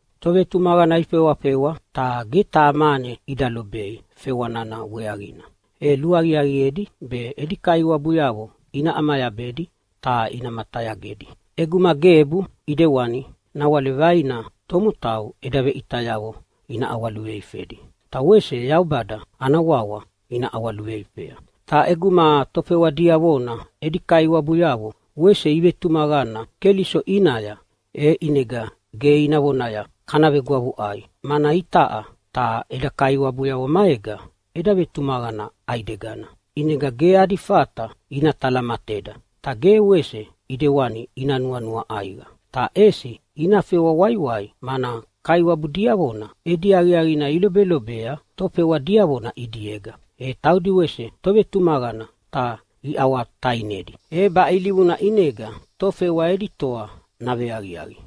Tovetumaqana ifewafewa ta ge taha mane ida lobei fewa nana weaqina, e luaqiaqiedi be edi kaiwabuyavo ina ʼamayabedi ta ina matayagedi. ʼEguma gebu ʼidewani nawale vaina tomotau eda veʼitayavo ina ʼawaluveifedi, ta wese Yaubada ana wawa ina ʼawaluveifea. Ta ʼeguma tofewa diavona edi kaiwabuyavo wese ivetumaqana Keliso ʼinaya, e ʼinega ge ina vonaya, “Kana vegwavuʼai, mana itaʼa ta eda kaiwabuyavo maega eda vetumaqana ʼaidegana, ʼinega ge adi fata ina talamateda.” Ta ge wese ʼidewana ina nuanua ʼaiqa, ta ʼesi ina fewa waiwai, mana kaiwabu diavona edi aqiaqina ilobelobea tofewa diavona ʼidiega, e taudi wese tovetumaqana ta iʼawatainedi. E baʼe ilivuna ʼinega tofewa edi toa naveaqiaqi.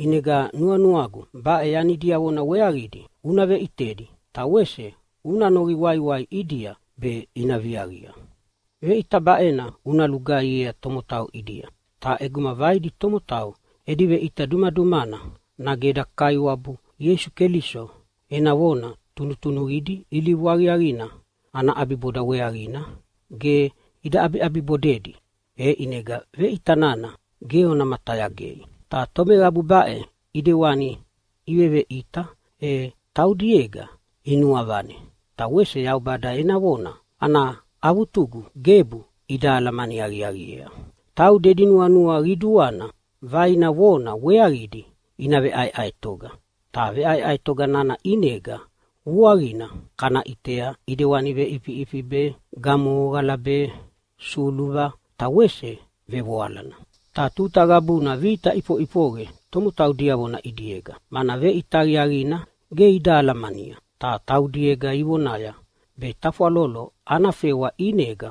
ʼInega nuanuagu baʼe yani diavona weaqidi una veʼitedi ta wese una noqi waiwai ʼidia be ina viaqia. Veʼita baʼena una lugaihiea tomotau ʼidia. Ta ʼeguma vaidi tomotau edi veʼita dumadumana, nage eda Kaiwabu Ieisu Keliso ena vona tunutunuqidi ilivu aqiaqina ana ʼabiboda weaqina ge ida ʼabibodedi, e ʼinega veʼita nana ge ona matayagei. Ta tomeqabu baʼe ʼidewani iveveʼita e taudiega inuavane ta wese Yaubada ena vona ana avutugu gebu ida alamani aqiaqiea. Taudi edi nuanua qiduana vaina vona weaqidi ina veʼaeʼaetoga. Ta veʼaeʼaetoga nana ʼinega vuaqina kana ʼitea ʼidewani veʼifiʼifi be, gamohoqala be, suluva ta wese vevoalana. Ta tuta qabuna vita ʼifoʼifoqe tomotau diavona ʼidiega, mana veʼita aqiaqina ge ida alamania. Ta taudiega ivonaya be tafwalolo ana fewa ʼinega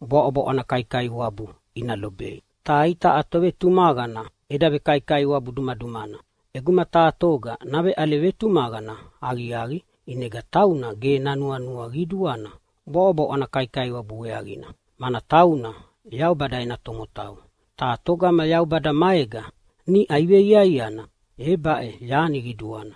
bwaʼobwaʼo ana kaikaiwabu ina lobei. Ta itaʼa tovetumaqana eda vekaikaiwabu dumadumana. ʼEguma taha toga naveʼale vetumaqana aqiaqi ʼinega tauna ge nanuanua qiduana bwaʼobwaʼo ana kaikaiwabu weaqina, mana tauna Yaubada ena tomotau. Ta togama Yaubada maega niʼa iveiaiana e baʼe yani qiduana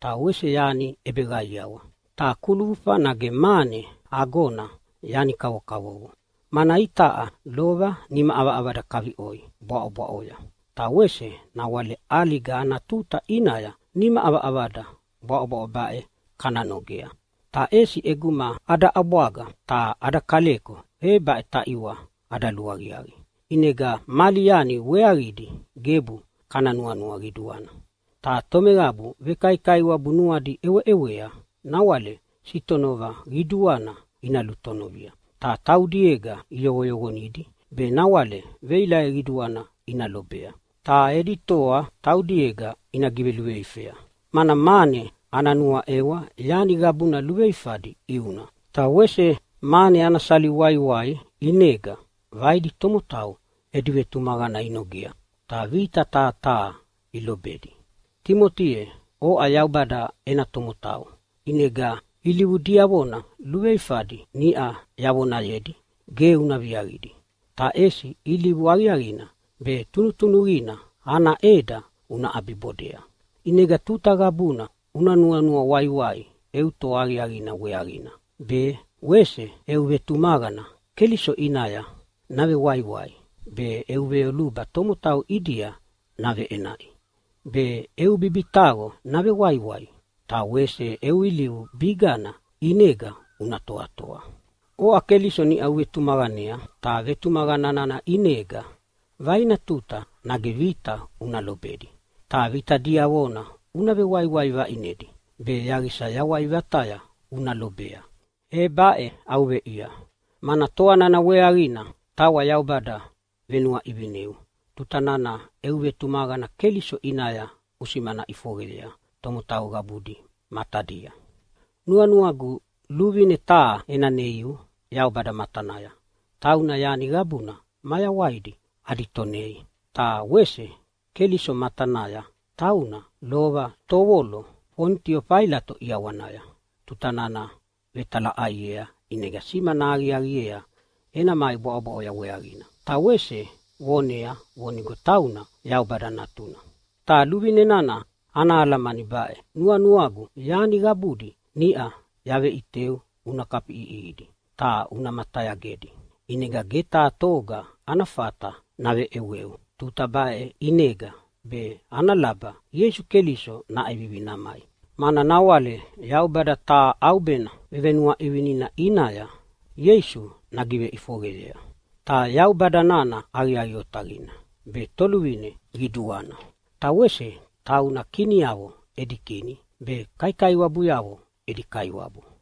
ta wese yani ʼebeqaiawa, ta kulufa nage mane agona yani kavokavovo. Mana itaʼa lova nima ʼavaʼavada kaviʼoi bwaʼobwaʼoya, ta wese nawale ʼaliga ana tuta ʼinaya nima ʼavaʼavada bwaʼobwaʼo baʼe kana nogea. Ta ʼesi ʼeguma ada ʼabwaga ta ada kaleko, e baʼe taʼiwa ada luaqiaqi. ʼInega mali yani weaqidi gebu kana nuanua qiduana. Ta tomeqabu vekaikaiwabu nuadi ʼeweʼewea nawale sitonova qiduana ina lutonovia, ta taudiega iyoqoyoqonidi be nawale veilaqe qiduana ina lobea ta edi toa taudiega ina giveluveifea. Mana mane ana nuaʼewa yani qabuna luveifadi ʼiuna, ta wese mane ana sali waiwai ʼinega vaidi tomotau edi vetumaqana inogea, ta vita taha taha ilobedi. Timoti ye, oʼa Yaubada ena tomotau, ʼinega ilivu diavona luveifadi niʼa yavonayedi ge una viaqidi, ta ʼesi ilivu aqiaqina be tunutunuqina ana ʼeda una ʼabibodea. ʼInega tuta qabuna una nuanua waiwai eu toa aqiaqina weaqina be, wese eu vetumaqana Keliso ʼinaya navewaiwai be, eu veyoluba tomotau ʼidia naveʼenaʼi be, eu bibitaqo navewaiwai, ta wese eu ilivu bigana ʼinega una toatoa. Oʼa Keliso niʼa uvetumaqanea, ta vetumaqana nana ʼinega vaina tuta nage vita una lobedi. Ta vita diavona una vewaiwai vaʼinedi be yaqisa yawai vataya una lobea, e baʼe au veʼia. Mana toa nana weaqina tawa Yaubada venuaʼivineu tuta nana eu vetumaqana Keliso ʼinaya usimana ʼifoqeyea tomotau qabudi matadia. Nuanuagu luvine taha ena neiu Yaubada matanaya, tauna yani qabuna mayawaidi adi Tonei, ta wese Keliso matanaya, tauna lova tovolo Fonitio Failato ʼiawanaya tuta nana vetalaʼaiea ʼinega simana aqiaqiea ena mai bwaʼobwaʼoya weaqina, ta wese vonea vonigo tauna Yaubada Natuna. Ta luvine nana ana alamani baʼe: Nuanuagu yani qabudi niʼa yaveʼiteu una kafiʼiʼihidi ta una matayagedi, ʼinega ge taha toga ana fata naveʼeweu tuta baʼe ʼinega be ana laba Ieisu Keliso naʼevivi namai. Mana nawale Yaubada taha ʼaubena vevenuaʼivinina ʼinaya Ieisu nagiveʼifoqeyea. Ta Yaubada nana aqiaqi otaqina be Toluvine Qiduana, ta wese tauna kiniavo edi Kini be kaiwabuyavo edi Kaiwabu.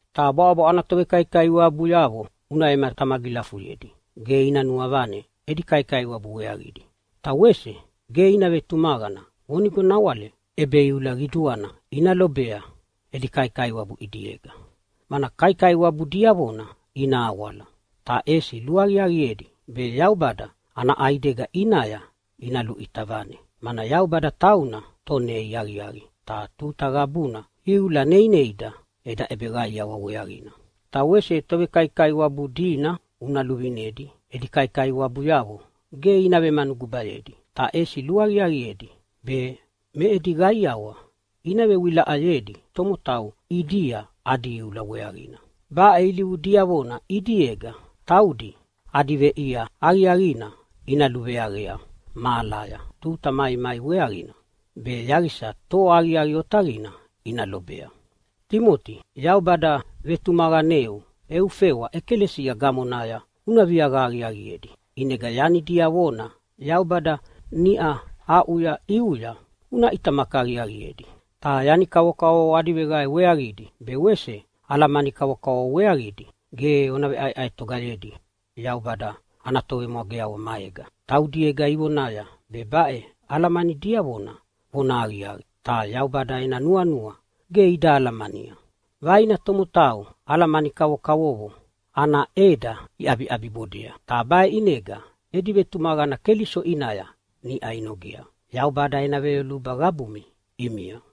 Ta bwaʼobwaʼo ana tovekaikaiwabuyavo una vematamagilafuyedi ge ina nuavane edi kaikaiwabu weaqidi. Ta wese ge ina vetumaqana vonigo nawale ʼebeiula qiduana ina lobei edi kaikaiwabu ʼidiega, mana kaikaiwabu diavona ina awala. Ta ʼesi luaqiaqiedi be Yaubada ana ʼaidega ʼinaya ina luʼita vane, mana Yaubada tauna Tonei aqiaqi, ta tuta qabuna iula neineida eda ʼebeqaiawa weaqina. Ta wese tovekaikaiwabu dina una luvinedi edi kaikaiwabuyavo ge ina vemanugubayedi, ta ʼesi luaqiaqiedi be me edi qaiawa ina vewilaʼayedi tomotau ʼidia adi iula weaqina. Baʼe ilivu diavona ʼidiega taudi adi veʼia aqiaqina ina luveaqea mahalaya tuta maimai weaqina, be yaqisa toa aqiaqi otaqina ina lobea. Timoti, Yaubada vetumaqaneu eu fewa ʼekalesia gamonaya una viaqa aqiaqiedi, ʼinega yani diavona Yaubada niʼa aʼuya ʼiuya una ʼitamaki aqiaqiedi. Ta yani kavokavovo adi veqae weaqidi be wese alamani kavokavovo weaqidi ge ona veʼaeʼaetogayedi Yaubada ana tovemwageavo maega. Taudiega ivonaya be baʼe alamani diavona vonahaqiaqi, ta Yaubada ena nuanua ge ida alamania. Vaina tomotau alamani kavokavovo ana ʼeda iʼabiʼabibodea. Ta baʼe ʼinega edi vetumaqana Keliso ʼinaya niʼa inogea. Yaubada ena veyoluba qabumi ʼimia.